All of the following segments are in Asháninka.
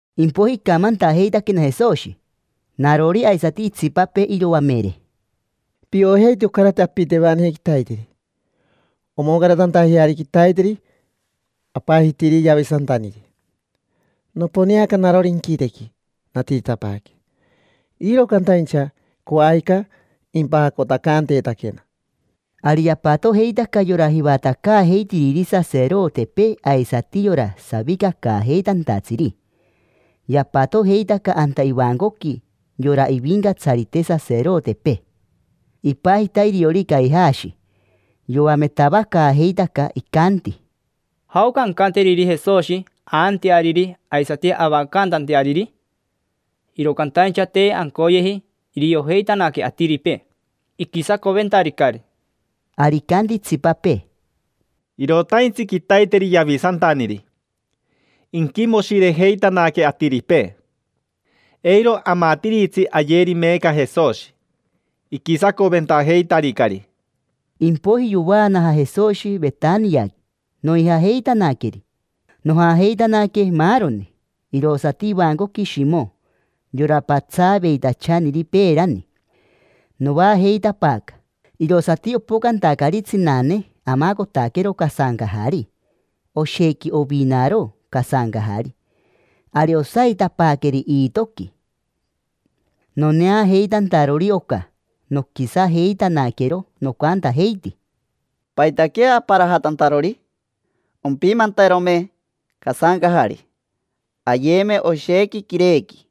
Impoiji icamantajeitaquena Jesoshi, narori aisati itsipapee iroamere: —Piojeiti ocarati apitenivani quitaiteri omoncaratantajeari quitaiteri apajitiri Yavisantaniri. Noponeaca narori inquitequi, natiritapaaque, iro cantaincha coajica impajacotacanteetaquena. Ari yapatojeitaca yora jivatacaajeitiriri saserotepee aisati yora savicacaajeitantatsiri. Yapatojeitaca anta ivancoqui yora ivincatsarite saserotepee. Ipajita iriori Caijashi. Yoametavacaajeitaca, icanti: —¿Jaoca ancanteriri Jesoshi aanteariri aisati avacantanteariri? Iro cantaincha te ancoyeji iriojeitanaque atiripee: iquisacoventaricari. Ari icanti itsipapee: —Irotaintsi quitaiteri Yavisantaniri: inquimoshirejeitanaque atiripee. Eiro amatiritsi ayeri meeca Jesoshi, iquisacoventajeitaricari. Impoiji yovaanaja Jesoshi Vetaniaqui, noijajeitanaqueri. Nojajeitanaque maaroni, irosati ivancoqui Shimo, yora patsaaveitachaniri peerani. Noajeitapaaca, irosati opocantacari tsinane amacotaquero casancajari. Oshequi ovinaro casancajari. Ari osaitapaaqueri iitoqui. Noneajeitantarori oca, noquisajeitanaquero, nocantajeiti: —¿Paitaquea aparajatantarori? Ompimanterome casancajari, ayeme oshequi quirequi,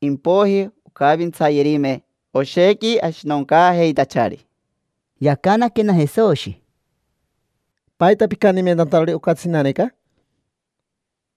impoiji oncavintsayerime oshequi ashinoncaajeitachari. Yacanaquena Jesoshi: —¿Paita picantimentantarori oca tsinaneca?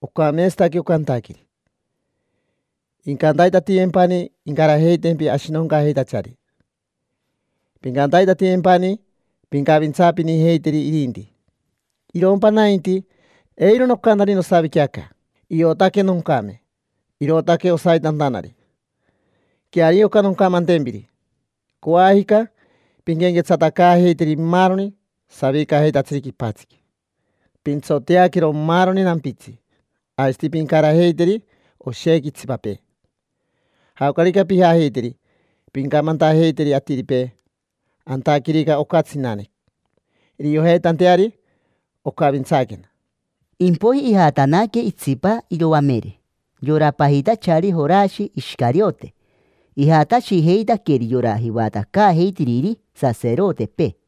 Ocameetsataque oca antaqueri. Incantaitatiyempani incarajeitempi ashinoncaajeitachari, pincantaitatiyempani pincavintsaapinijeiteri irinti. Irompa nainti, eiro nocantani nosavique aca. Iotaque noncame, irootaque osaitantanari. Queario oca noncamantempiri: coajica pinquenquetsatacaajeiteri maaroni savicajeitatsiri quipatsiqui, pintsoteaquero maaroni nampitsi, aisati pincarajeiteri oshequi itsipapee. Jaocarica pijajeiteri pincamantajeiteri atiripee antaquerica oca tsinane, iriojeitanteari ocavintsaquena. Impoiji ijatanaque itsipa iroamere, yora pajitachari Jorashi Ishicariote. Ijatashijeitaqueri yora jivatacaajeitiriri saserotepee,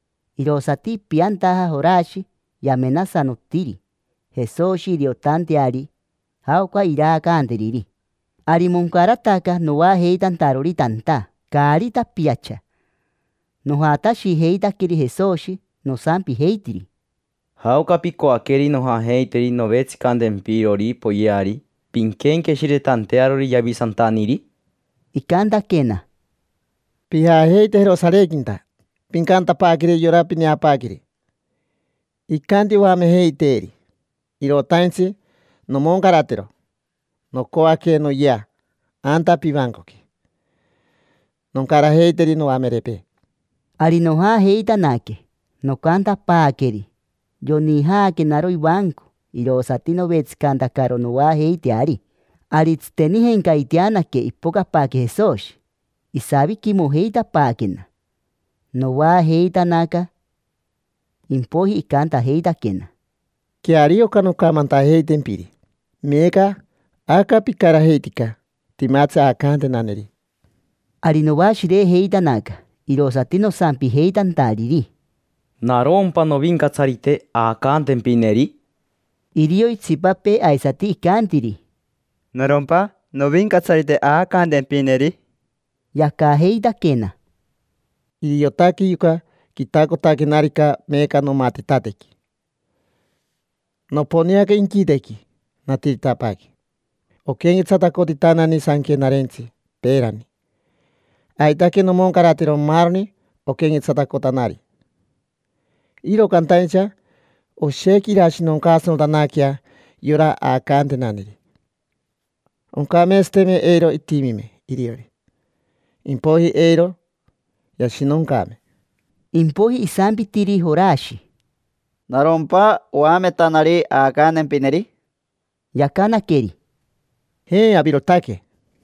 Irosati ipiantaja Jorashi, yamenasanotiri Jesoshi iriotanteari jaoca iraacanteriri. Ari moncarataca noajeitantarori tanta caari tapiacha. Nojatashijeitaqueri Jesoshi, nosampijeitiri: —¿Jaoca picoaqueri nojajeiteri novetsicantempirori poyeari pinquenqueshiretantearori Yavisantaniri? Icantaquena: —Pijajeite Jerosarequinta, pincantapaaqueri yora pineapaaqueri: “Icanti oamejeiteeri: ‘Irotaintsi nomoncaratero. Nocoaque noyea anta pivancoqui, noncarajeiteri noamerepee’”. Ari nojajeitanaque, nocantapaaqueri. Yonijaquenaro ivanco, irosati novetsicantacaro noajeiteari. Ari tsitenijencaiteanaque ipocapaaque Jesoshi, isaviquimojeitapaaquena, noajeitanaca. Impoiji icantajeitaquena: —Queario oca noncamantajeitempiri: meeca, aca picarajeitica, timatsi aacantenaneri. Ari noashirejeitanaca, irosati nosampijeitantariri: —¿Narompa, novincatsarite, aacantempineri? Irio itsipapee aisati icantiri: —¿Narompa, novincatsarite, aacantempineri? Yacajeitaquena: —Iriotaque yoca quitacotaquenarica meeca nomatitatequi. Noponeaca inquitequi, natiritapaaque. Oquenquetsatacotanani Sanquenarentsi peerani, aitaque nomoncaratero maaroni oquequetsatacotanari. Iro cantaincha oshequi irashinoncaasanotanaquea yora aacantenaneri. Oncameetsateme eiro itimime iriori, impoiji eiro yashinoncaame. Impoiji isampitiri Jorashi: —¿Narompa, oametanari, aacantempineri? Yacanaqueri: —Je, avirotaque.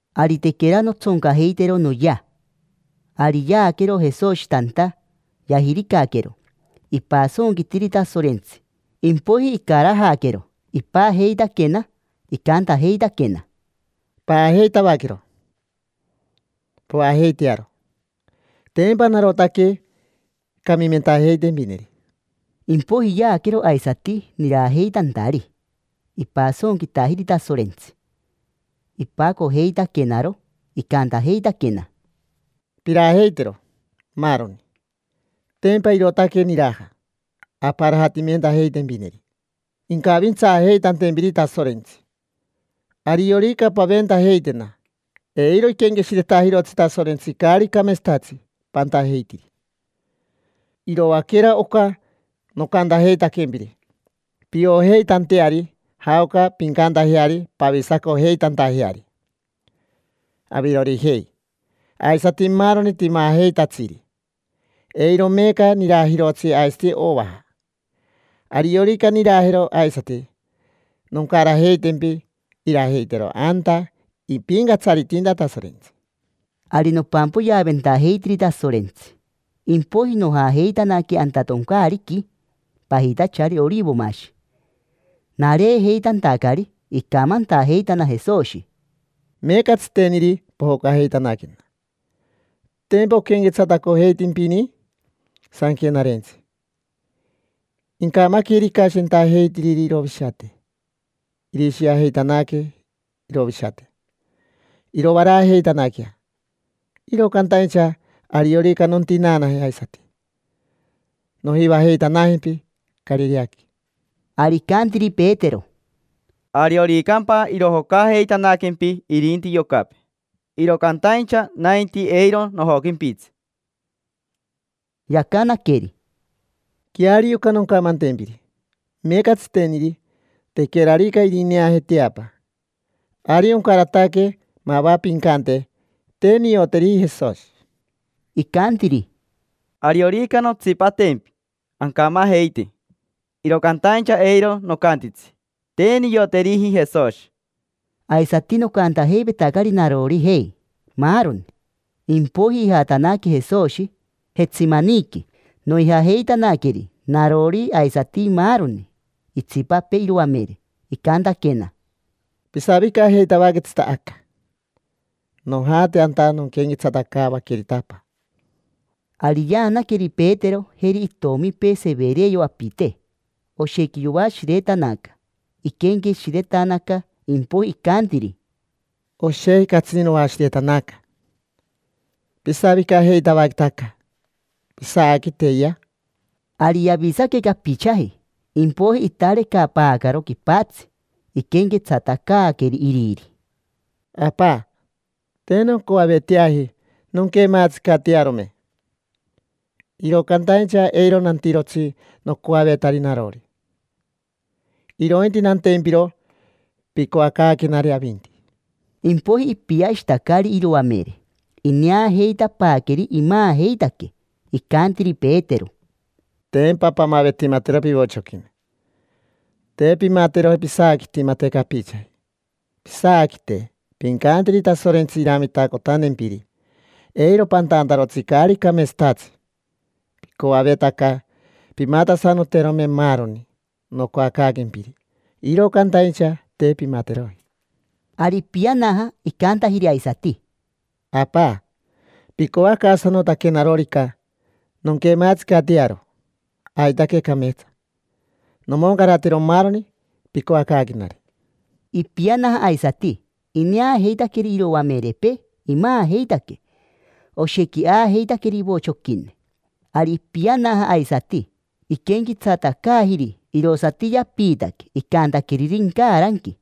Ari tequera nontsoncajeitero noyea, ari yaaquero Jesoshi tanta, yajiricaquero, ipasonquitiri Tasorentsi. Impoiji icarajaquero, ipajeitaquena, icantajeitaquena: —Paajeitavaquero, poajeitearo. Tempa narotaque camimentajeitempineri. Impoiji yaaquero aisati nirajeitantari, ipasonquitajiri Tasorentsi. Ipacojeitaquenaro, icantajeitaquena: —Pirajeitero, maaroni. Tempa irootaque niraja amparajatimentajeitempineri, incavintsaajeitantempiri Tasorentsi. Ariorica paventajeitena, eiro iquenqueshiretajirotsi Tasorentsi caari cameetsatatsi pantajeitiri. Iroaquera oca nocantajeitaquempiri piojeitanteari jaoca pincantajeari pavisacojeitantajeari: avirorijei, aisati maaroni timajeitatsiri. Eiro meeca nirajirotsi aisati ovaja. Ariorica nirajero aisati, noncarajeitempi irajeitero anta ipincatsaritinta Tasorentsi. Ari nopampoyeaventajeitiri Tasorentsi, impoiji nojajeitanaque anta toncaariqui pajitachari Orivomashi. Nareejeitantacari, icamantajeitana Jesoshi: —Meeca tsiteniri pojocajeitanaquena. Tempa oquenquetsatacojeitimpini Sanquenarentsi: “Incamaquerica shentajeitiriri irovishate, irishiajeitanaque irovishate, irovaraajeitanaquea”. Iro cantaincha ariorica nontinaanaje aisati, nojivajeitanajempi Carireaqui. Ari icantiri Petero: —Arioricampa irojocajeitanaquempi irinti yocapee, iro cantaincha nainti, eiro nojoquimpitsi. Yacanaqueri: —Queario oca noncamantempiri: meeca tsiteniri, tequerarica irineaje teapa, ari oncarataque mava pincante: “Te nioteriji Jesoshi”. Icantiri: —Ariorica nontsipatempi ancamajeite, iro cantaincha eiro nocantitsi: “Te nioteriji Jesoshi”. Aisati nocantajeivetacari narorijei, maaroni. Impoiji ijatanaque Jesoshi Jetsemaniqui, noijajeitanaqueri: narori, aisati maaroni itsipapee iroamere. Icantaquena: —Pisavicajeitavaquetsita aca: nojate anta nonquenquetsatacaavaquerita Apa. Ari yaanaqueri Petero, jeri itomipee Severeo apite. Oshequi yoashiretanaca, iquenqueshiretanaca. Impoiji icantiri: —Oshequi catsini noashiretanaca. Pisavicajeitavaqueta aca, pisaaquiteyea. Ari yavisaque capichaji, impoiji itarecapaacaro quipatsi, iquenquetsatacaaqueri Iriri: —Apa, te noncoaveteaji nonquemaatsicatearome, iro cantaincha eiro nantirotsi nocoavetari narori, irointi nantempiro picoacaaquenari avinti. Impoiji ipiashitacari iroamere, ineajeitapaaqueri imaajeitaque. Icantiri Petero: —Tempa pamavetimatero pivochoquine, te pimateroji pisaaquitimate capichaji. Pisaaquite, pincanteri Tasorentsi iramitacotantempiri eiro pantantarotsi caari cameetsatatsi. Picoavetaca pimatasanoterome maaroni nocoacaaquempiri, iro cantaincha te pimateroji. Ari ipianaja, icantajiri aisati: —Apa, picoacaasanotaquenarorica nonquemaatsicatearo, aitaque cameetsa: nomoncaratero maaroni picoacaaquenari. Ipianaja aisati, ineajeitaqueri iroamerepee, imaajeitaque: oshequi aajeitaqueri ivochoquine. Ari ipianaja aisati, iquenquetsatacaajiri. Irosati yapiitaque icantaqueriri incaranqui.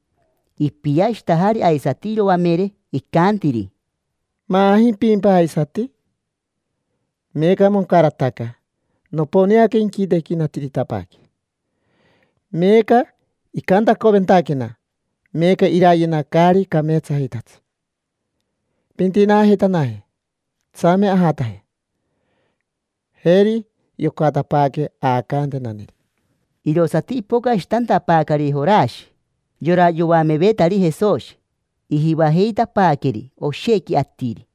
Ipiashitajari aisati iroamere, icantiri: —¿Maajimpimpa aisati? Meeca moncarataca. Noponeaca inquitequi, natiritapaaque; meeca icantacoventaquena, meeca irayena caari cameetsajeitatsi. Pintinaajeitanaje, tsame ajataje. Jeri, yocatapaaque aacantenaneri. Irosati ipocashitantapaacari Jorashi, yora yoamevetari Jesoshi: ijivajeitapaaqueri oshequi atiri.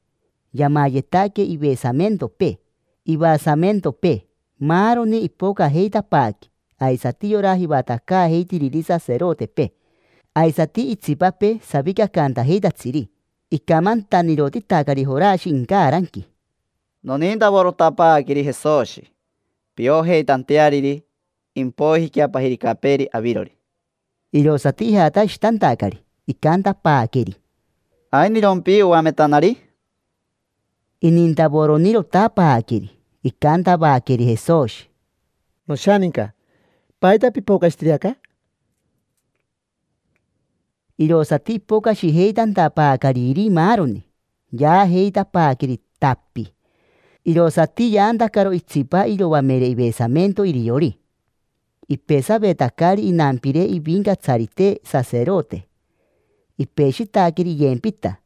Yamayetaque ivesamentopee, ivasamentopee, maaroni. Ipocajeitapaaque aisati yora jivatacaajeitiriri saserotepee aisati itsipapee savicacantajeitatsiri. Icamantanirotitacari Jorashi incaranqui: —Nonintavorotapaaqueri Jesoshi, piojeitanteariri. Impoijiquea pajiricapeeri avirori. Irosati ijatashitantacari, icantapaaqueri: —¿Ainirompi, oametanari? Inintavoronirotapaaqueri. Icantavaqueri Jesoshi: —Noshaninca, ¿paita pipocashitiri aca? Irosati ipocashijeitantapaacariri maaroni, yaajeitapaaqueri, tapi. Irosati yaantacaro itsipa iroamere ivesamento iriori, ipesavetacari inampire ivincatsarite saserote. Ipeshitaqueri iyempita.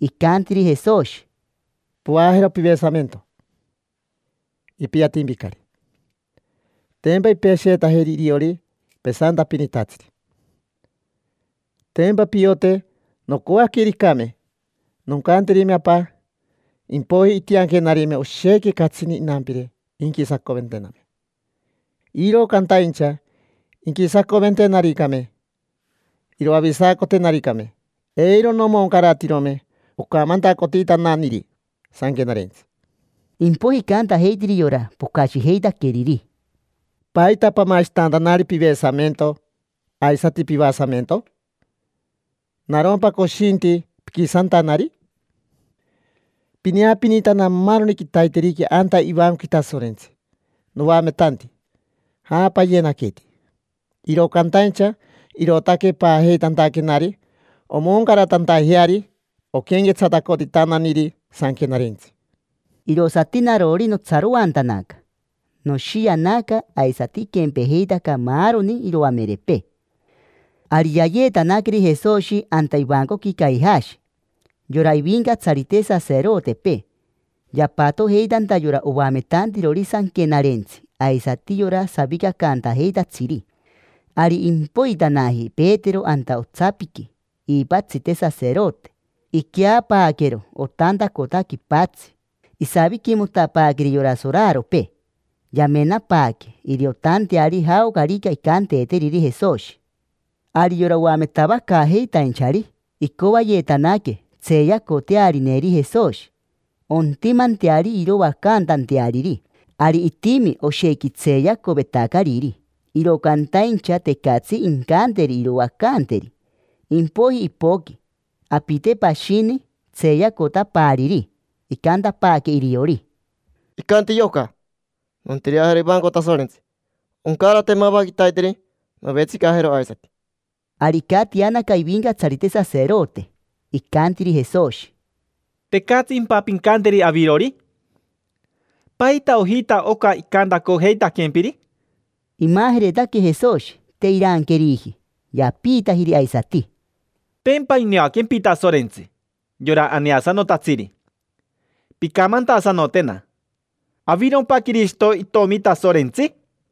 Icantiri Jesoshi: —Poajero pivesamento, ipiatimpicari. Tempa impesheetajeri iriori pesantapinitatsiri. Tempa piote noncoaquericame, noncanterime Apa, impoiji intianquenarime oshequi catsini inampire inquisacoventename. Iro cantaincha inquisacoventenaricame, iroavisacotenaricame, eiro nomoncaratirome ocamantacotitananiri Sanquenarentsi. Impoiji icantajeitiri yora pocashijeitaqueriri: —¿Paita pamashitantanari pivesamento aisati pivasamento? ¿Narompa coshinti piquisantanari? Pineapinitana maaroni quitaiteriqui anta ivancoqui Tasorentsi, noametanti; ja, payenaniqueti. Iro cantaincha irootaque paajeitantaquenari omoncaratantajeari oquenquetsatacotitananiri Sanquenarentsi. Irosati narori notsaroantanaca, noshianaca. Aisati iquempejeitaca maaroni iroamerepee. Ari yayeetanaqueri Jesoshi anta ivancoqui Caijashi: yora ivincatsarite saserotepee. Yapatojeitanta yora oametantirori Sanquenarentsi aisati yora savicacantajeitatsiri. Ari impoitanaji Petero anta otsapiqui iipatsite saserote. Iqueapaaquero otantacota quipatsi, isaviquimotapaaqueri yora soraropee. Yamenapaaque iriotanteari jaocarica incanteeteriri Jesoshi. Ari yora oametavacaajeitainchari icoayetanaque tseeyacotearineri Jesoshi, ontimanteari iroacantanteariri. Ari itimi oshequi tseeyacovetacariri, iro cantaincha tecatsi incanteri iroacanteri. Impoiji ipoqui apite pashini tseeyacotapaariri, icantapaaque iriori: —Icanti yoca: “Nontireajero ivanco Tasorentsi: oncarate mava quitaiteri novetsicajero aisati”. Ari icatianaca ivincatsarite saserote, icantiri Jesoshi: —¿Tecatsimpa pincanteri avirori? ¿Paita ojita oca icantacojeitaquempiri? Imajeretaque Jesoshi, te iranqueriji. Yapiitajiri aisati: —Tempa ineaquempi Tasorentsi, yora aneasanotatsiri. Pincamantasanotena: ¿avirompa Quirishito, Itomi Tasorentsi?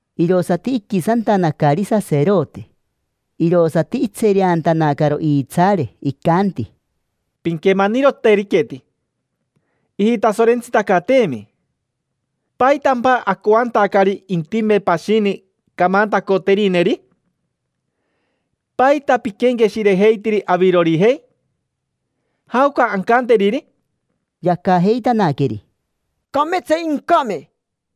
Irosati iquisantanacari saserote, irosati itsereantanacaro iitsaare. Icanti: —Pinquemaniroteriqueti: ijitasorentsitacateemi. ¿Paitampa acoantacari intime pashini camantacoterineri? ¿Paita piquenqueshirejeitiri avirorijei? ¿Jaoca ancanteriri? Yacajeitanaqueri: —Cameetsa incame.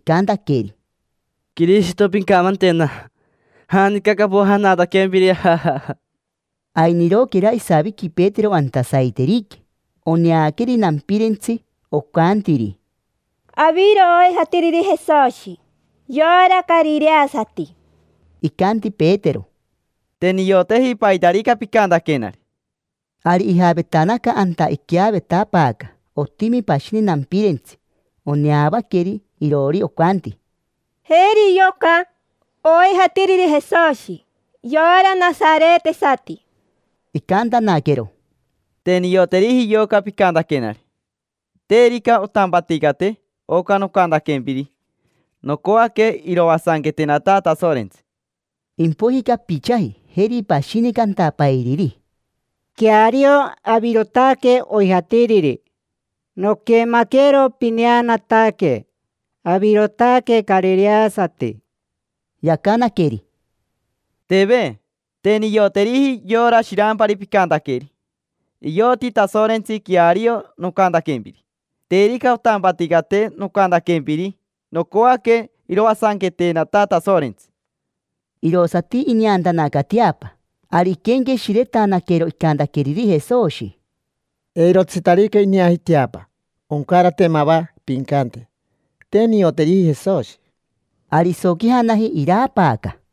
icantaqueri: —Quirishito, pincamantena: ¿janica capojanataquempiri? Ainiroquera isaviqui Petero anta saiteriqui. Oneaqueri nampirentsi, ocantiri: —Aviro oijatiriri Jesoshi, yora carireasati. Icanti Petero: —Te nioteji paitarica picantaquenari. Ari ijavetanaca anta iqueavetapaaca, otimi pashini nampirentsi, oneavaqueri iroori, ocanti: —Jeri yoca oijatiriri Jesoshi, yora nasaretesati. Icantanaquero: —Te nioteriji yoca picantaquenari. Terica ontampaticate oca nocantaquempiri, nocoaque iroasanquetenata Tasorentsi. Impoiji capichaji, jeri pashini cantapairiri: —Queario, avirotaque oijatiriri: noquemaquero pineanataque, avirotaque carireasati. Yacanaqueri: —Teve, te nioteriji yora shirampari picantaqueri. Ioti Tasorentsi queario nocantaquempiri. Terica ontampaticate nocantaquempiri, nocoaque iroasanquetenata Tasorentsi. Irosati ineantanaca teapa. Ari iquenqueshiretanaquero icantaqueriri Jesoshi: “Eirotsitarica ineaji teapa, oncarate mava pincante: ‘Te nioteriji Jesoshi’”. Ari isoquijanaji, iraapaaca jii, jii.